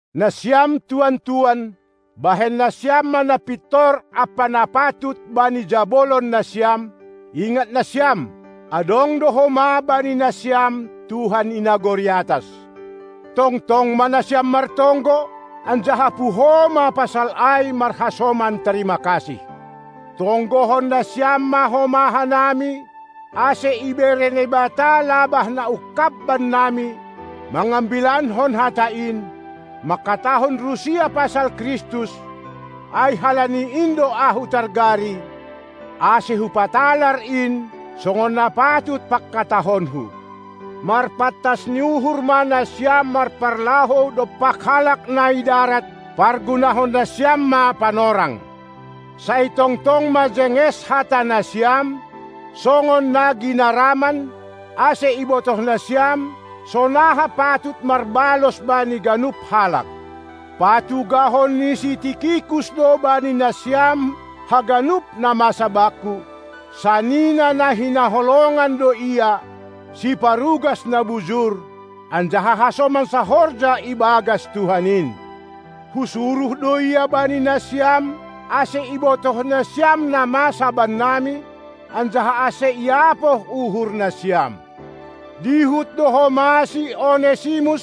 Nasiam tuan-tuan, bahen nasiam ma na pintor ampa na patut bani jabolon nasiam, ingat nasiam: Adong do homa bani nasiam Tuhan i nagori atas. Tongtong ma nasiam martonggo, anjaha puho ma pasal ai marhasoman tarima kasih. Tonggohon nasiam ma homa hanami, ase ibere Naibata labah na ungkab bannami mangambilankon hata in, mangkatahon rusia pasal Kristus, ai halani in do ahu targari, ase hupatalar in, songon na patut pangkatahonku. Marpantas ni uhur ma nasiam marparlahou dompak halak na i darat; pargunahon nasiam ma panorang. Sai tongtong ma jenges hata nasiam, songon na ginaraman, ase ibotoh nasiam, sonaha patut marbalos bani ganup halak. Patugahon ni si Tikikus do bani nasiam haganup na masa bakku; sanina na hinaholongan do ia, siparugas na bujur, anjaha hasoman sahorja ibagas Tuhan in. Husuruh do ia bani nasiam, ase ibotoh nasiam na masa bannami, anjaha ase iapoh uhur nasiam. Dihut do homa si Onesimus,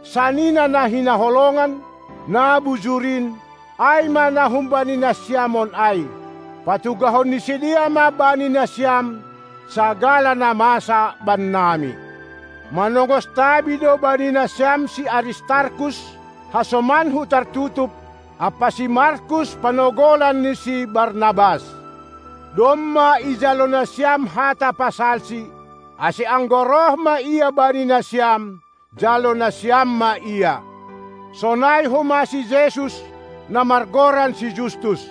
sanina na hinaholongan, na bujur in, ai ma na humbani nasiam on ai. Patugahon ni sidea ma bani nasiam sagala na masa bannami. Manongos tabi do bani nasiam si Aristarkus, hasomanku tartutup, ampa si Markus, panogolan ni si Barnabas. Domma ijalo nasiam hata pasalsi, ase anggo roh ma ia bani nasiam, jalo nasiam ma ia. Sonai homa si Jesus, na margoran si Justus.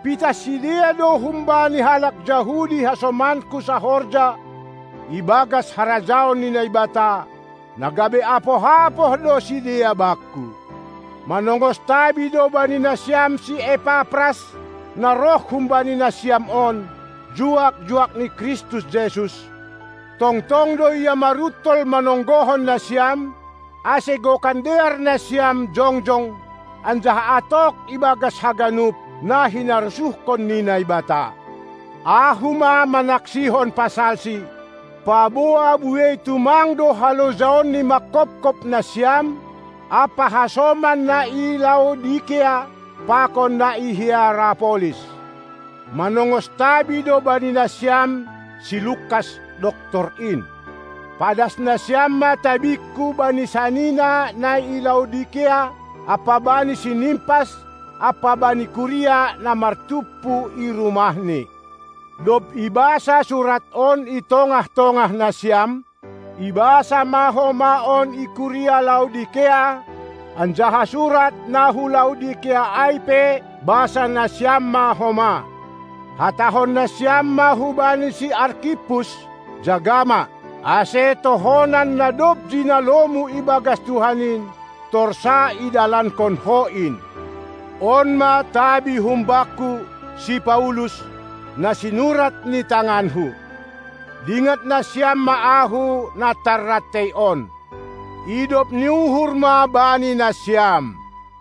Pitah sidea do humbani halak Jahudi hasomanku sahorja ibagas harajaon ni Naibata; na gabe apoh-apoh do sidea bakku. Manongos tabi do bani nasiam si Epapras, na roh humbani nasiam on, juak-juak ni Kristus Jesus; tongtong do ia maruntol manonggohon nasiam, ase gokan dear nasiam jongjong anjaha atok ibagas haganup, na hinarosuhkon ni Naibata. Ahu ma manaksihon pasalsi, paboa buei tumang do halojaonni manghophop nasiam ampa hasoman na i Laodikea pakon na i Hierapolis. Manongos tabi do bani nasiam si Lukas, doktor in. Padas nasiam ma tabingku bani sanina na i Laodikea ampa bani si Nimpas ampa bani kuria na martumpu i rumahni. Dob ibasa surat on i tongah-tongah nasiam, ibasa ma homa on i kuria Laodikea; anjaha surat na hu Laodikea ai pe basa nasiam ma homa. Hatahon nasiam ma hubani si Arkippus: Jaga ma, ase tohonan na dob jinalomu ibagas Tuhan in, torsa idalankon ho in! On ma tabi humbakku, si Paulus, na sinurat ni tanganku. Dingat nasiam ma ahu, na tarrantei on. Idop ni uhur ma bani nasiam.